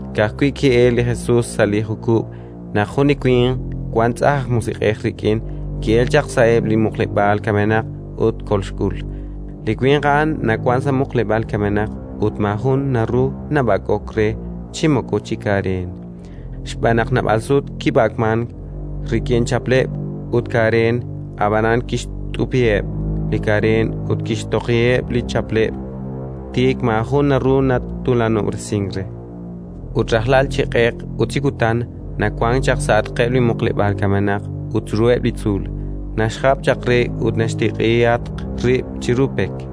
Ka'ajwi' ki'elk li Jesus sa' li jukub' naq jun winq li wank tz'ajn aj musiq'ej rik'in ki'elk chaq sa'eb' li muqleb'aal kamenaq ut kolxk'ul. Li winq a'an nawank sa' muqleb'aal kamenaq ut maajun naru nab'ak'ok re chi moko chi kareen, xb'aan naq naab'al sut kib'ak'mank rik'in chapleb' ut kareen, ab'anan kixt'upiheb' li kareen ut kixtoqiheb' li chapleb': tik maajun naru natuulanob'resink re. Ut rajlal, chi q'eq ut chi kutan, nawank chaq sa'atqeb' li muqleb'aal kamenaq ut chiruheb' li tzuul, naxjap chaq re ut naxtiq'ihatq rib' chiru pek.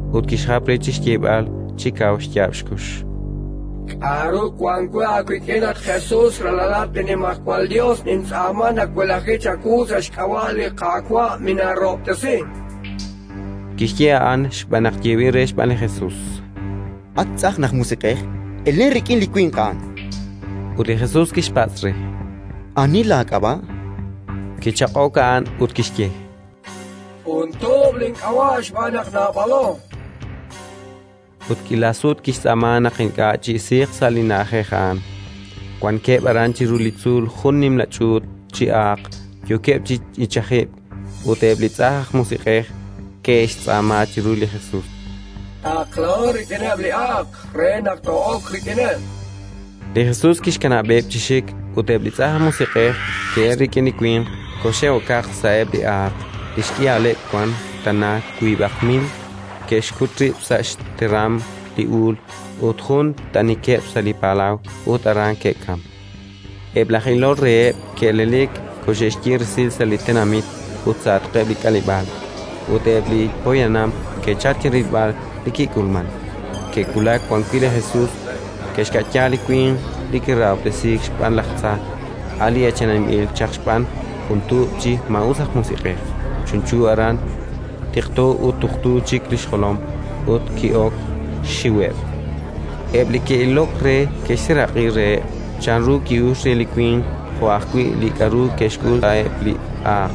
ut kixjap re chi xyeeb'al chi kaw xyaab' xkux: —K'aru wank we aawik'in, at Jesus, Ralalat li Nimajwal Yos! Nintz'aama nawelaji chawu sa' xk'ab'a' li Qaawa', minaarahob'tesi. Kixye a'an xb'aan naq yeeb'il re xb'aan li Jesus: —At tz'ajn aj musiq'ej, elen rik'in li winq a'an! Ut li Jesus kixpatz' re: —Ani laak'ab'a'? Kichaq'ok a'an ut kixye: —Jun tuub' link'ab'a', xb'aan naq naab'alo. Ut k'iila sut kixtz'aama naq ink'a' chi'isiiq sa' li na'ajej a'an. Wankeb' aran chiru li tzuul jun nimla ch'uut chi aaq, yookeb' chi ichajib'k. Ut eb' li tz'ajn aj musiq'ej ke'xtz'aama chiru li Jesus: —Taqlaho rik'ineb' li aaq re naq too'ok rik'ineb'. Li Jesus kixkanab'eb' chi xik, ut eb' li tz'ajn aj musiq'ej ke'elk rik'in li winq, koxe'okaq sa'eb' li aaq (li xk'ihaleb' wank tana wiib'aq mil), ke'xkut rib' sa' xteram li uul, jun t'anikeb' sa' li palaw, ut aran ke'kamk. Eb' laj ilol reheb' ke'elelik, koxe'xye resil sa' li tenamit ut sa'atqeb' li k'aleb'aal; ut eb' li poyanam ke'chalk chi rilb'al li kik'ulmank. Ke'wulak wan wi' li Jesus, ke'xka'ya li winq li kirahob'tesiik xb'aan laj tza, a' li eechaninb'il chaq xb'aan jun tuub' chi maa'us aj musiq'ej, chunchu aran, tiqto ut tuqtu chik li xjolom: ut ki'ok xxiweb'. Eb' li ke'ilok re ke'xseeraq'i reheb' chanru ki'uxk re li winq jo' ajwi' li k'aru ke'xk'ul eb' li aaq.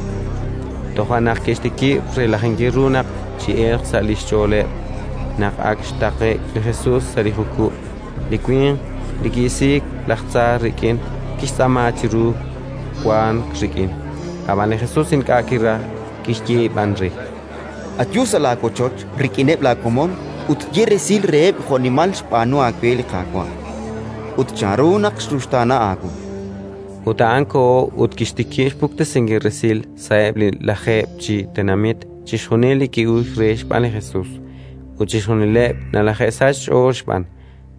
Toja' naq ke'xtikib' relajinkil ru naq chi'elq sa' li xch'och'eb'. Naq ak xtaqe'k li Jesus sa' li jukub', li winq li ki'isiik laj tza rik'in kixtz'aama chiru wank rik'in. Ab'an li Jesus ink'a' kiraj, kixye b'an re: —Ayu sa' laawochoch rik'ineb' laakomon ut ye resil reheb' jo'nimal li xb'aanu aawe li Qaawa' ut chanru naq xruxtaana aawu. Ut a'an koho ut kixtikib' xpuktesinkil resil sa'eb' li Lajeeb' chi Tenamit chixjunil li ki'uxk re xb'aan li Jesus; ut chixjunileb' nalaje'sachk xch'ool xb'aan.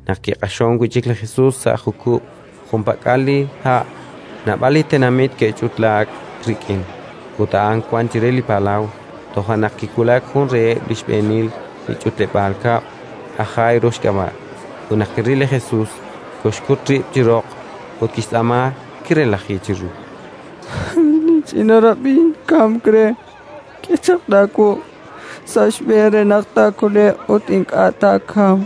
Naq kiq'axonk wi' chik li Jesus sa' jukub' junpak'al li ha', naab'al li tenamit ke'ch'utlaak rik'in; ut a'an wank chire li palaw. Toja' naq kiwulak jun reheb' li xb'eenil li ch'utleb'aal kab'l, aj Jairo xk'ab'a', ut naq kiril ru li Jesus, koxkut rib' chi roq ut kixtz'aama kirelaji chiru: —Linch'ina rab'in kamk re. K'e chaq laawuq' sa' xb'een re naq taakole'q ut ink'a' taakamq.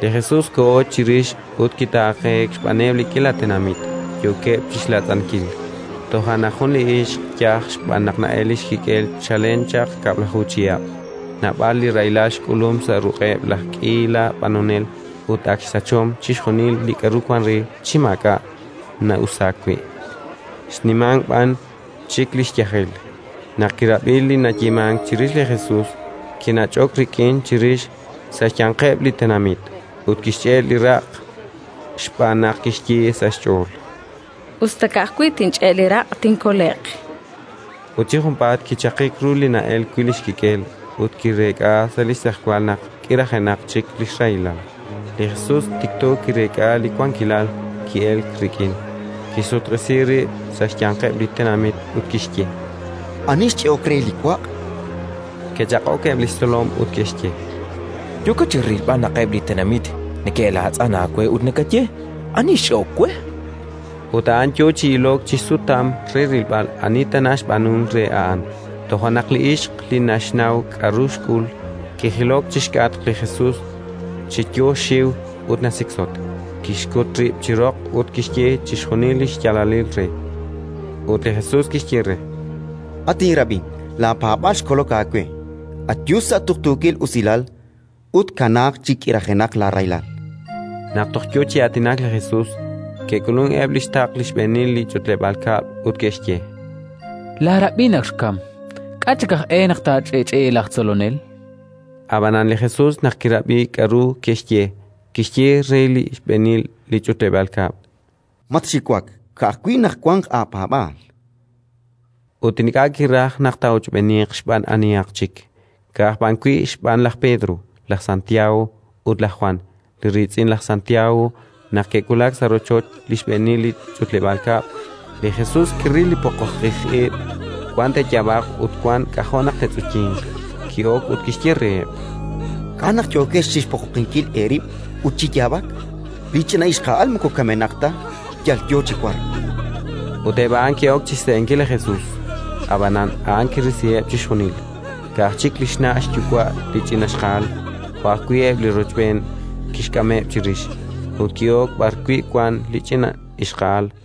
Li Jesus koho chirix ut kitaaqeek xb'aaneb' li k'iila tenamit, yookeb' chi xlaatz'ankil. Toja' naq jun li ixq yaj xb'aan naq na'elk xkik'el chalen chaq kab'laju chihab' (naab'al li rahilal xk'ulum sa' ruq'eb' laj k'iila b'anonel ut ak xsachom chixjunil li k'aru wank re chi maak'a' na'usaak wi', xnimank b'an chik li xyajel), naq kirab'i li nayeemank chirix li Jesus, kinach'ok rik'in chirix, sa' xyanqeb' li tenamit, ut kixch'e' li raq', xb'aan naq kixye sa' xch'ool: “Us ta ka'ajwi' tinch'e' li raq', tinkole'q”. Ut chi junpaat kichaqik ru li na'elk wi' li xkik'el ut kireek'a sa' li xtz'ejwal naq k'irajenaq chik li xrahilal. Li Jesus tikto kireek'a li wankilal ki'elk rik'in: kixsutq'isi rib' sa' xyanqeb' li tenamit ut kixye: —Ani xch'e'ok re li waq'? Ke'chaq'ok eb' li xtzolom ut ke'xye: —Yookat chi rilb'al naq eb' li tenamit neke'laatz'an aawe ut nakaye: «Ani xch'e'ok we?». Ut a'an yo chi ilok chi xsutam re rilb'al ani tana xb'aanunk re a'an. Toja' naq li ixq li naxnaw k'aru xk'ul, kijilok chi xk'atq li Jesus chi yo xxiw ut nasiksotk, kixkut rib' chi roq ut kixye chixjunil li xyaalalil re. Ut li Jesus kixye re: —At inrab'in, laapaab'aal xkolok aawe. Ayu sa' tuqtuukil usilal ut kanaaq chi k'irajenaq laarahilal. Naq toj yo chi aatinak li Jesus, ke'k'ulunk eb' li xtaql li xb'eenil li ch'utleb'aal kab'l ut ke'xye: —Laarab'in ak xkamk. K'a' chik aj e naq taach'i'ch'i'i laj Tzolonel? Ab'anan li Jesus, naq kirab'i k'aru ke'xye, kixye re li xb'eenil li ch'utleb'aal kab'l: —Matxiwak, ka'ajwi' naq wanq aapaab'aal. Ut ink'a' kiraj naq taa'ochb'eeniiq xb'aan anihaq chik, ka'aj b'an wi' xb'aan laj Pedro, laj Santiago ut laj Jwan, li riitz'in laj Santiago. Naq ke'wulak sa' rochoch li xb'eenil li ch'utleb'aal kab'l, li Jesus kiril li poqoqij ib': wan te'yaab'aq ut wan k'ajo' naq te'tz'uyinq. Ki'ok ut kixye reheb': —K'a' naq yookex chi xpoqoqinkil eerib' ut chi yaab'ak? Li ch'ina ixqa'al moko kamenaq ta, yal yo chi wark. Ut eb' a'an ke'ok chi xse'enkil li Jesus; ab'an a'an kirisiheb' chixjunil; ka'aj chik li xna' xyuwa' li ch'ina ixqa'al, jo' ajwi' eb' li rochb'een kixk'ameb' chirix, ut ki'ok b'arwi' wank li ch'ina ixqa'al.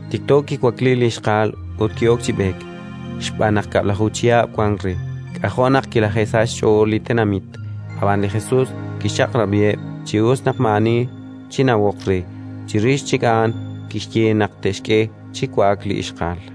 Tikto kiwakliik li ixqa'al ut ki'ok chi b'eek, xb'aan naq kab'laju chihab' wank re. K'ajo' naq kilaje'sachk xch'ool li tenamit. Ab'an li Jesus kixchaq'rab'iheb' chi us naq maa'ani chinawoq re; chirix chik a'an kixye naq te'xk'e chi wa'ak li ixqa'al.